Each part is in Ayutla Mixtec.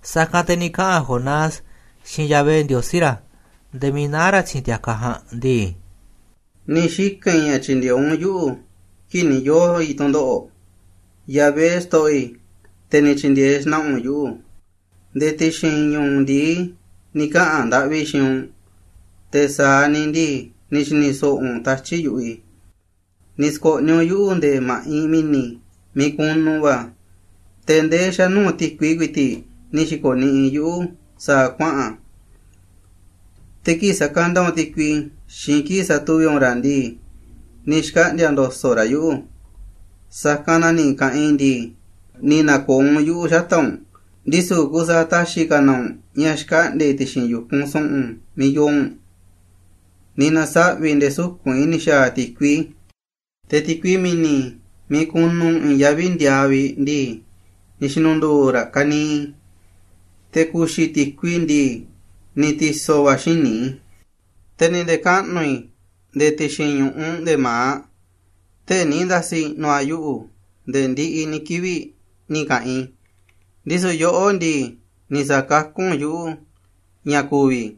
Sa̱kanꞌ te̱ ni̱ kaꞌa̱n Jonás xiinꞌ Yahvé Ndiosí ra̱, nde̱e̱ miiꞌ naá ra̱ ti̱xi̱n ti̱a̱kaꞌ ja̱a̱nꞌ ndii: ―Ni̱ xika̱n i̱ ña̱ tyi̱ndi̱e̱eꞌ u̱nꞌ yuꞌu̱ kii̱ꞌ ni̱ yoo̱ i̱ tu̱ndoꞌo̱ꞌ, Yahvé xto̱ꞌo̱ i̱, te̱ ni̱ tyi̱ndi̱e̱eꞌ xna̱ꞌa̱ u̱nꞌ yuꞌu̱. Nde̱e̱ ti̱xi̱n ñu̱u̱ ndi̱i ni̱ kaꞌa̱n ndaꞌvi i̱ xiinꞌ u̱nꞌ, te̱ sa̱aꞌ ni̱ ndii, ni̱ xi̱ni̱ so̱ꞌo̱ u̱nꞌ tatyi̱ꞌ yu̱ꞌuꞌ i̱. Ni̱ sko̱ꞌniꞌ u̱nꞌ yuꞌu̱ nde̱e̱ ma̱ꞌinꞌ mi̱ni̱ miiꞌ kunu va̱, te̱ ndee xa̱ nuu̱ꞌ ti̱kui kui̱ti̱ꞌ ni̱ xi̱ko̱ niꞌiꞌ yuꞌu̱ sa̱a̱ kuaꞌa̱n. Te̱ kii̱ꞌ sakanda u̱nꞌ ti̱kui xiinꞌ kii̱ꞌ satuvi̱ꞌ u̱nꞌ ra̱ ndii, ni̱ xkaꞌndi̱a̱ ndo̱so̱ꞌ raꞌ yuꞌu̱. Sa̱kanꞌ na ni̱ ka̱ꞌanꞌ i̱ ndii, ni̱ na̱ko̱o̱ u̱nꞌ yuꞌu̱ xata̱ꞌ u̱nꞌ, ndisu̱ kusaaꞌ ta̱xi̱ ka̱ na u̱nꞌ xkaꞌndi̱a̱ i̱ ti̱xi̱n yu̱kunꞌ su̱ꞌu̱n miiꞌ yoo u̱nꞌ. Ni̱ na̱saꞌvi̱ nde̱e̱ suku̱nꞌ i̱ ni̱ xa̱a̱ ti̱kui, te̱ ti̱kui mi̱ni̱, miiꞌ kunu i̱i̱n yaví ndiaaꞌ vi̱ꞌ ndii, ni̱ xi̱nu̱ndu̱u̱ raꞌ ka̱niiꞌ i̱. Te̱ ku̱xi̱ ti̱kui ndii, ni̱ ti̱so̱ va̱ a̱ xíniꞌ i̱. Te̱ ni̱ nde̱kaꞌnu̱ i̱ nde̱e̱ ti̱xi̱n ñu̱ꞌuꞌ nde̱e̱ ma̱aꞌ, tee̱ꞌ ni̱ nda̱si̱ i̱ꞌnu̱ a̱ yuꞌu̱ nde̱e̱ ndiꞌiꞌ ni̱ kivi̱ꞌ ni̱ ka̱ꞌanꞌ i̱, ndisu̱ yoꞌó ndii, ni̱ sa̱kakú u̱nꞌ yuꞌu̱ ña̱ ku̱vi̱ i̱,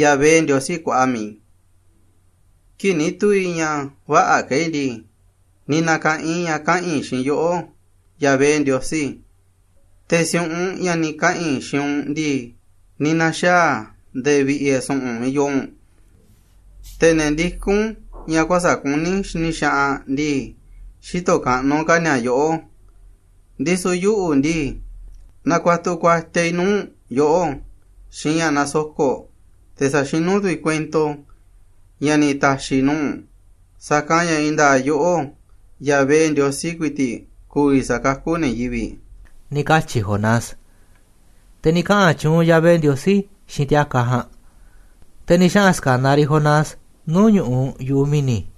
Yahvé Ndiosí kuaꞌa mi̱iꞌ i̱. Kii̱ꞌ ni̱ tu̱u̱ i̱ ña̱ vä̱ꞌa̱ ka̱ i̱ ndii, ni̱ na̱ka̱ꞌan i̱ ña̱ kaꞌa̱n i̱ xiinꞌ yoꞌó Yahvé Ndiosí, te̱ si̱u̱ꞌunꞌ ña̱ ni̱ kaꞌa̱n i̱ xiinꞌ u̱nꞌ ndii, ni̱ na̱xaa̱ a̱ nde̱e̱ vi̱ꞌe̱ su̱ꞌu̱n miiꞌ yoo u̱nꞌ. Te̱ ne̱ ndikún ña̱ kuä̱sa̱ꞌ kuní xini xaꞌanꞌ ndii, xïtoꞌ kaꞌnuꞌ ka̱ ni̱a̱ yoꞌó. Ndisu̱ yuꞌu̱ ndii, na̱kua̱tu̱ kuatiaꞌ i̱ nuu̱ꞌ yoꞌó xiinꞌ ña̱ nasoko̱ꞌ, te̱ sa̱xinú tu̱ i̱ kuento i̱ ña̱ ni̱ ta̱xi̱ i̱ nuu̱ꞌ u̱nꞌ. Sa̱kanꞌ ña̱ i̱i̱n nda̱a̱ꞌ yoꞌó, Yahvé Ndiosí kui̱ti̱ꞌ ku̱vi̱ sa̱kakú ne̱ yivi̱ꞌ ―ni̱ katyi̱ Jonás. Te̱ ni̱ kaꞌa̱n tyuunꞌ Yahvé Ndiosí xiinꞌ ti̱a̱kaꞌ ja̱a̱nꞌ, te̱ ni̱ xaꞌa̱n ska̱naꞌ riꞌ Jonás nuu̱ꞌ ñu̱ꞌuꞌ yu̱ꞌuꞌ mi̱ni̱.